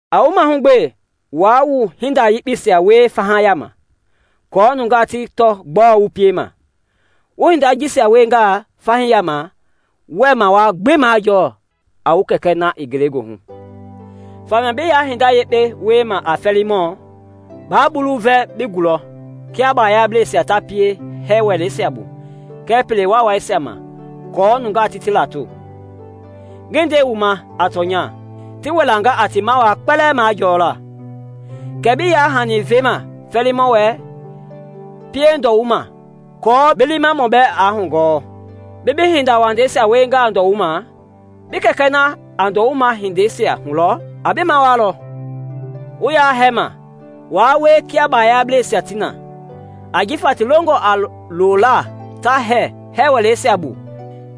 “A wu mahugbe waa wu hinda yekpeisia wie faha yama aako nungaa ti tɔ gbɔɔ wu piema. Wu hindei jisia wiengaa fahii yama wɛɛ mawaa gbi majɔɔ a wu Kɛkɛ na i Ngelegoohu. “Famia bi ya hinda yekpe wiema a fɛɛlimɔ, ba bulu vɛ bi gulɔ kia baayablɛisia ta pie hɛɛ wɛleisia bu kɛɛ pele waawaisia ma aako nungaa ti ti lato. Ngi nde wu ma a tɔnya, ti wilanga a ti mawaa kpɛlɛɛ majɔla. Kɛɛ bi yaa hani vema fɛɛlimɔ wɛ, pie ndɔwuma aako bi liimamɔ bɛɛ aa hugɔɔ. Bi bi hinda wandɛisia wiengaa ndɔwuma, bi Kɛkɛ na a ndɔwuma hindeisia hulɔ a bi mawaalɔ. “Wu ya hɛɛma, waa wie kia baayablɛisia ti na; ajifa ti longɔ a loola ta hɛɛ hɛɛ wɛleisia bu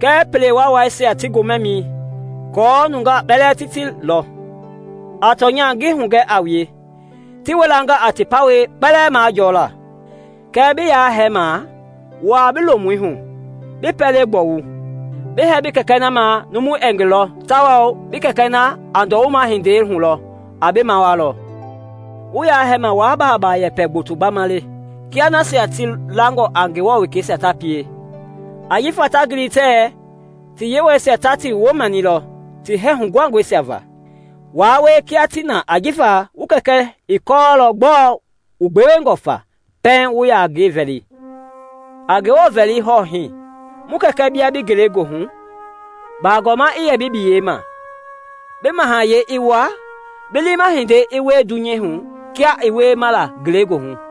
kɛɛ pele waawaisia ti gomɛmɛi, aako numui kpɛlɛɛ ti ti lɔ. A tɔnya ngi hugɛ a wue, ti wilanga a ti pawɛi kpɛlɛɛ majɔla. Kɛɛ bi yaa hɛɛma, wuaa bi lomui hu, bi pɛlei gbɔwu, bi hɛɛ bi Kɛkɛ na ma numu ɛɛ ngi lɔ tawao bi Kɛkɛ na a ndɔwuma hindei hulɔ, a bi mawaalɔ. “Wu ya hɛɛma waa baaba yɛpɛ gboto gbama le, kia nasia ti langɔ a Ngewɔ wekeisia ta pie, ajifa ta gili tɛɛ ti yewɔisia ta ti woo mɛnilɔ ti hɛɛ huguhangɔisia va. Waa wie kia ti na ajifa wu Kɛkɛ i kɔɔlɔ gbɔɔ wu gbewengɔ fa pɛiŋ wu ya ngi vɛli. A Ngewɔ vɛli hɔɔ hii: ‘Mu Kɛkɛ bia bi Ngelegoohu bagɔma i yɛ bi biyei ma. Bi mahayɛi i wa, Bi liima hindei i wie dunyei hu, kia i wiema la Ngelegoohu.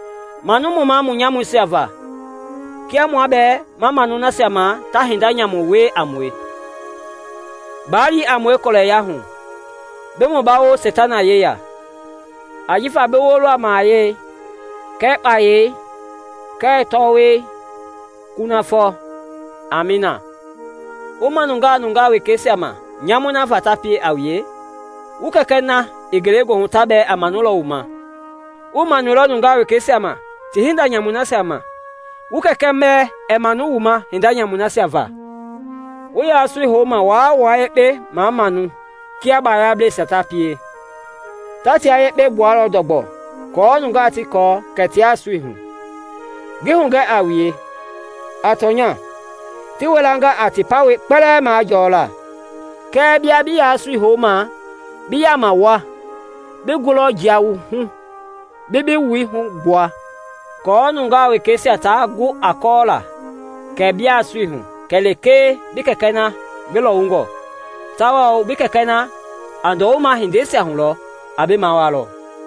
Manu mu ma mu nyamuisia va, Kia mua bɛɛ ma manu nasia ma ta hinda nyamu wie a mue; Baa li a mue kɔlɛya hu, bi mu mabawo Seitana yeya.’ Ajifa bi woo lɔ a mahayɛi kɛɛ kpayei kɛɛ tɔwɔi, kunafɔ. Amiina. “Wu manungaa nungaa wekeisia ma nyamui nasia va ti pienga a wue, wu Kɛkɛ na i Ngelegoohu ta bɛɛ a manulɔ wu ma. Wuii manuilɔ nungaa wekeisia ti hinda nyamuisia ma, wu Kɛkɛ bɛɛ ɛɛ manu wu hinda nyamuisia ma. “Wu ya sui houma waa wua yekpe mamamau kia bayablɛisia ta pie. Ta tia yekpe gbualɔ ndɔgbɔ aako nungaa gbi ti tɔ kɛ tia sui hu. Ngi hugɛ a wue, a tɔnya, ti wilanga a ti pawɛi kpɛlɛɛ majɔɔlaa. Kɛɛ bia bi ya sui houma, bi yama wua, bi ngulɔi jia wuhu bi bi wui hugbua; aako nungaa wekeisia taa gu a kɔɔla kɛ bia sui hu kɛlee bi Kɛkɛ na ngi lɔwungɔ; tawao bi Kɛkɛ na a ndɔwuma hindeisia hulɔ, a bi mawaalɔ.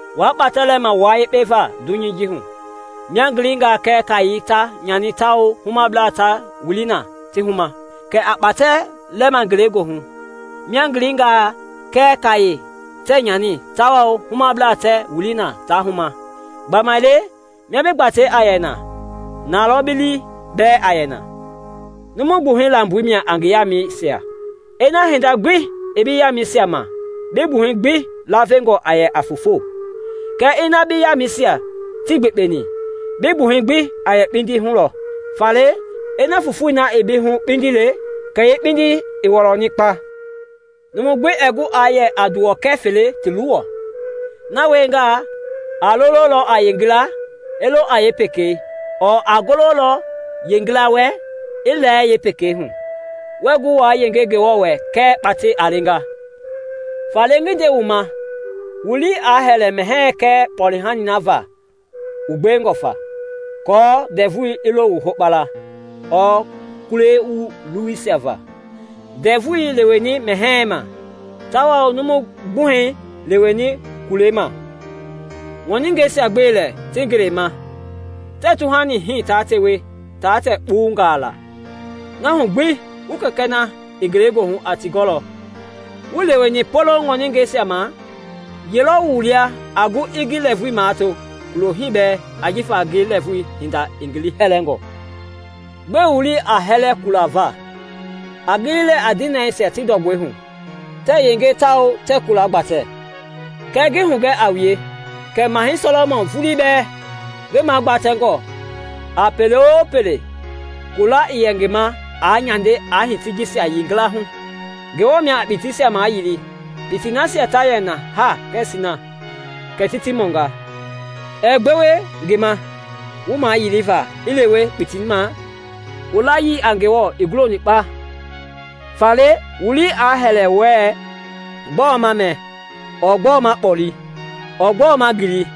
“Waa kpatɛ lɛma wua yekpe va dunyɛi ji hu, mia gilingaa kɛɛ kaayei ta nyani tawao humablaa ta wili na ti huma. Kɛɛ a kpatɛi lɛma Ngelegoohu, mia gilingaa kɛɛ kaaye tɛɛ nyani tawao humablaa tɛɛ wili na ta huma. Gbamaile mia bi gbatei a yɛ na, na lɔ bi lii bɛɛ a yɛ na. “Numu gbuhɛi lamboi mia a ngi yamɛisia. Ina hinda gbi ii bi yamɛisia ma bi gbuhɛi gbi lavengɔ a yɛla a foofo; kɛɛ ina bi yamɛisia tii gbekpeni, bi gbuhɛi gbi a yɛ kpindi hu lɔ. Faale ina fofoi na i bi hu kpindi le, kɛ yeekpindii i wɔlɔni kpa! “Numu gbi ɛɛ gu aa yɛ a nduwɔkɛ fele ti luwɔ; na wiengaa, a lololɔ a yeengila, i lo a yeepekei ɔɔ a gololɔ yeengila wɛ, i lɛɛ yeepekei hu. Wɛɛ gu wa yenge Ngewɔ wɛ kɛɛ kpatɛi a leenga. “Faale ngi nde wu ma, wu lii aa hɛlɛ mɛhɛɛ kɛɛ kpɔlehanii na va wu gbengɔ fa aako ndɛvui i lo wu hokpala, ɔɔ kulei wu luwuisia va. Ndɛvui leweni mɛhɛɛ ma, tawao numu gbuhɛi leweni kulei ma! Ŋɔningɛisia gbe lɛ ti ngelei ma; tɛɛ tuhani hii ta tewe ta tɛ kpuwungaa laa; na hu gbi wu Kɛkɛ na i Ngelegoohu a ti gɔlɔ! Wuii leweni poloŋ ŋɔningaa ma? Ye lɔ wu lia a gu i ngi lɛɛvui mato kulo hii bɛɛ ajifa ngi lɛɛvui hinda i ngi liihɛngɔ? “Gbɛe wu lii a hɛlɛ kulei va? A gili lɛɛ a dinɛisia ti ndɔgbɔi hu, tɛɛ yenge tawao tɛɛ kula gbatɛ. Kɛɛ ngi hugɛ a wue kɛ Mahɛi Sɔlɔmɔn vulii bɛɛ, ngi gbatɛngɔ a pele-o-pele, kula ii yɛ ngi ma aa nyande aa hiti jisia yilayee hu. Ngewɔ mia a kpitiisia mayili kpitii nasia ta yɛ na haa kɛɛ sina kɛ ti ti mɔnga. Ɛɛ gbewe ngi ma wu mayiliva i lewe kpitii ma? Wu layii a Ngewɔ gulongɔe kpa! “Faale wu lii aa hɛlɛ wɛɛ ‘Gbɔɔ ma mɛ?’ ɔɔ ‘Gbɔɔ ma kpoli?’ ɔɔ ‘Gbɔɔ ma ngili?’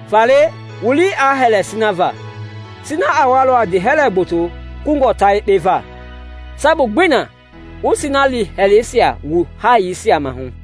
Faale wu lii aa hɛlɛ sina va; sina a walɔ a ndiihɛlɛ gboto kungɔ ta yekpe va. Sabu gbii na wu sina liihɛlɛisia wu haayei sia maahu.